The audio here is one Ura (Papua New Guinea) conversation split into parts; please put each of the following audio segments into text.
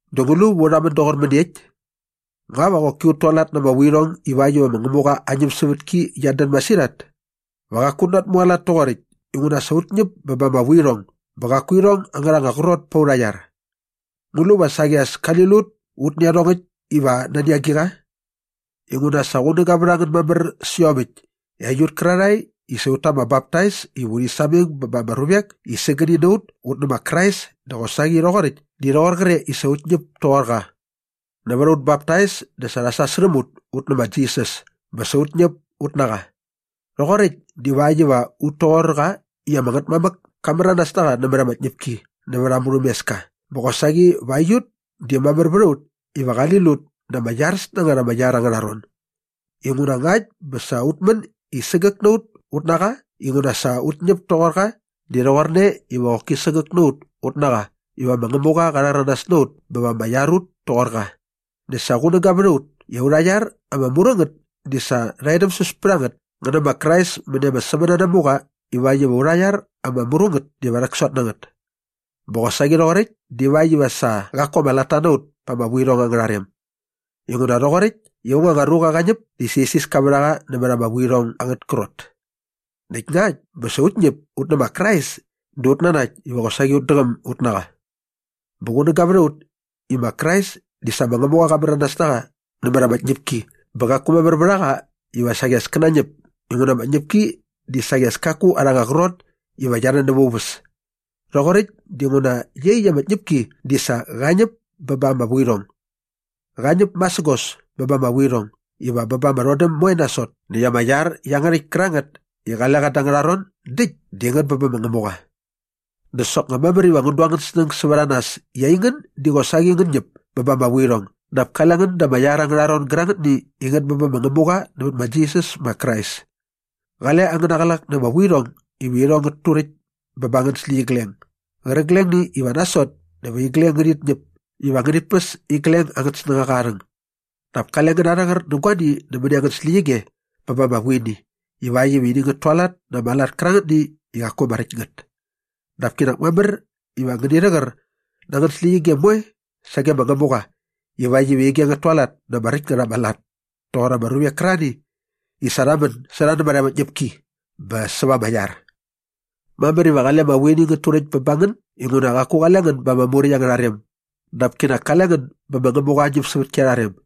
Dä ngu lu va u rhamän doqor mäniekt? Nga va qoki ut tualat na ama vuirhong ivakt iva ma Ngämuqa aa ñämsävätki qiat dän masirhat? Va qaku ut natmualat toqoräkt inguna sa ut ñäp bä ba ama vuirhong bä qaku irhong angärha anga qrot pät aurha iar. Ngu lu va saqi as kali lut ut nä iarhongäkt iva nani agiqa? Inguna sa qunäga vät a ngän mamär sä iomäkt i aiut kärarhae i sa ut ta ama baptais iva urhi sameng ba ama ruvek i sägäni na ut ut nä ma Krais dä qosaqi rhoqoräkt di rhoqor qre i sa ut ñäp toqor qa. Nävät aut baptais dä sa rha sasärhäm ut ut nä ma Jisas bä sa ut ñäp ut na qa. Rhoqoräkt divakt iva ut toqor qa i ama Ngätmamäk ka märanas na qa nämät ama tñäpki nävät aa murhämeska bä qosaqi va aiut di mamär vät a ut iva qali lut da ama iaräs na ngät ama iar angärha ron. Inguna ngakt bä sa ut män i sägäk na ut ut na qa inguna sa ut ñäp toqor qa di rhoqorne iva qoki sägäk na ut ut na qa iva ma Ngämuqa qa rhäranas na ut bä va ama iar ut toqor qa. Näkt sa qunäga vät a ut i aurha iar ama mru ngät di sa rha edämsäs pät a ngät ngä nä ma Krais mäni ama sämänanamuqa ivakt iva aurha iar ama mru ngät diva rhäksot na ngät. Bä qosaqi rhoqoräkt divakt iva sa qaku ama latta na ut pa ama vuirhong angärha rem. Inguna rhoqoräkt i aung anga ruqa qa ñäp dä sa isiska vät a qa nämät ama vuirhong angät krot. Näkt ngakt bä sa ut ñäp ut nä ma Krais dä ut nanakt iva qosaqi ut däqäm ut na qa. Bä qunäga vät a ut i ma Krais di sa ma Ngämuqa qa märanas na qa nämät ama tñäpki bä qaku mamär vät a qa iva saqi as kä nañäp inguna ama tñäpki di saqi as kaku arha anga qrot iva qia rhän näva aa uväs. Rhoqoräkt dinguna iaqyäkt aa tñäpki di sa qa ñäp bä ba ama vuirhong. Qa ñäp masägos bä ba ama vuirhong iva bä ba ama rhodäm moe nasot näkt ama iar iangärhäkt kärangät i qale qa da angärha ron däkt di ngät bä bä ma Ngämuqa. Dä soknga mamär iva ngän du angän snäng sävät a nas i aingän di qosaqi ngän ñäp bä ba ama vuirhong dap kale ngän da ama iar angärha ron gärangätni i ngät bä bä ma Ngämuqa nävät ma Jisas ma Krais. Qale angäna qlak na ama vuirhong iva irhong ngät turäkt bä ba angän släqyigleng gärqiglengni iva nasot dä va igleng ngärhit ñäp iva ngänit päs igleng angät snängaqa aa rhäng. Dap kale ngän narhäqär nä guani nämäni angän släqyige bä ba ama vuini ivakt iva ini ngät tualat na ama lat kärangätni i qaku ama räkt ngät. Dap kinak mamär iva ngäni rhäqär na angän släqyige moe sage ma Ngämuqa ivakt iva ige ngät tualat na ama räkt ngät ama lat toqor ama ruvek kärarhani i sa qa män sä rha nämät ama tñäpki bä säva ama iar. Mamär iva qale ama vuini ngät turäkt bä ba ngän inguna qaku qale ngän ba ama Muräkt angärha rem dap kale ngän bä ma Ngämuqa aa ñämsävätki arha rem.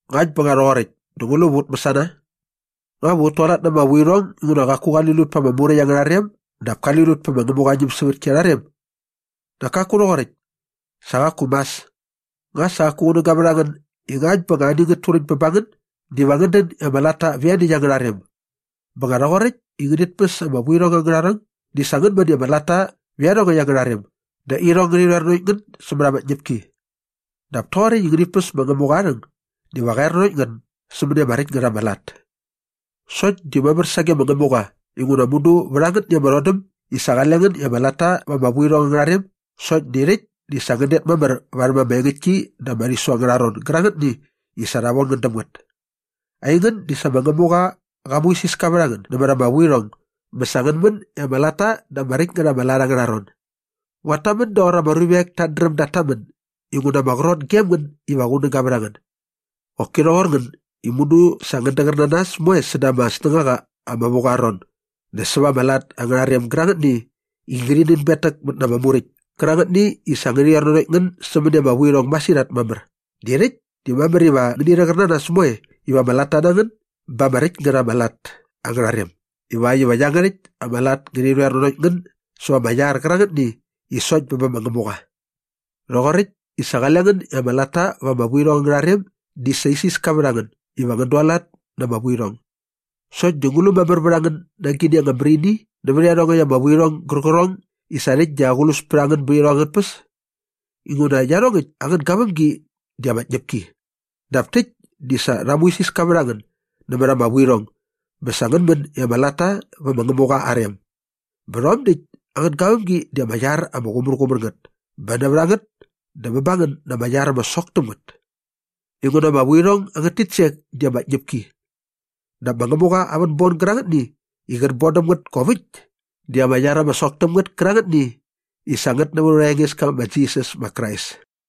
Ngäkt bä nga rhoqoräkt dä ngu lu va ut mäsana? Nga va ut tualat na ama vuirhong inguna qaku qali lut pa ama Muräkt angärha rem dap kali lut pä ma Ngämuqa aa ñämsävätki arha rem? Nak kaku rhoqoräkt! Sa qaku mas. Nga sa qaku qunäga vät a ngän i ngakt bä ani ngät turäkt bä ba ngän diva ngän dän i ama latta va ianiäkt angärha rem. Bä nga rhoqoräkt i ngänit päs ama vuirhong angärha rhäng di sa ngän män i ama latta vä irhong angärha rem dä irhong ngärhi rhoer nanokt ngän sämät ama tñäpki. Dap toqoräkt i ngänit päs ma Ngämuqa aa rhäng diva qa er nanokt ngän sämäni ama räkt ngät ama lat. Sokt di mamär sage ma Ngämuqa inguna mudu vät angätni ama rhodäm di sa qale ngän i ama latta va ama vuirhong angärha rem sokt di rhäkt di sa ngän det mamär värhäm ama engäktki da ama rhisu angärha ron gärangätni i sa rha von ngän däm ngät. Aingän di sa ma Ngämuqa qa muisiska vät a ngän nämät ama vuirhong bä sa ngän män i ama latta da ama räkt ngät ama lat angärha ron. Nguat tamän doqor ama ruvek tat dräm dat tamän inguna ama qrot gem ngän iva qunäga vät ngän. Qoki rhoqor ngän i mudu sa ngän däqär na nas moe säda ama snängaqa ama vu qa aa ron dä säva ama lat angärha rem gärangätni i ngärhi nänbetäkmät na ama Muräkt kärangätni i sa ngärhi rhoer nanokt ngän sämäni ama vuirhong masirhat mamär di rhäkt di mamär iva ngäni rhäqär na nas moe iva ama latta na ngän ba ama räkt ngät ama lat angärha rem ivakt iva iangärhäkt ama lat ngärhi rhoer nanokt ngän säva ama iar qärangätni i sokt bä bä ma Ngämuqa. Rhoqoräkt i sa qale ngän i ama latta va ama vuirhong angärha rem di sa isiska vät a ngän iva ngän dualat na ama vuirhong. Sokt di ngu lu mamär vät a ngän na agini ama mär ini nävät iarhongäkt ama vuirhong gärqärhong i sa rhäkt di aqlus pät a ngän bät irhong angät tpäs? Inguna iarhongäkt angät gavämgi di ama tñäpki. Dap täkt di sa rha muisiska vät a ngän nämät ama vuirhong bä sa ngän män i ama latta vä ma Ngämuqa aa rem. Bä rhom däkt angät gavämgi di ama iar ama qumärqumär ngät bä nävät a ngät dä bä ba ngän na ama iar ama sok täm ngät. Inguna ama vuirhong angät titsek di ama tñäpki. Dap ma Ngämuqa aa vänbon gärangätni i qät bon däm ngät kop äkt di ama iar ama sok täm ngät kärangätni i sa ngät nävät aurha Engeska ma Jisas ma Krais.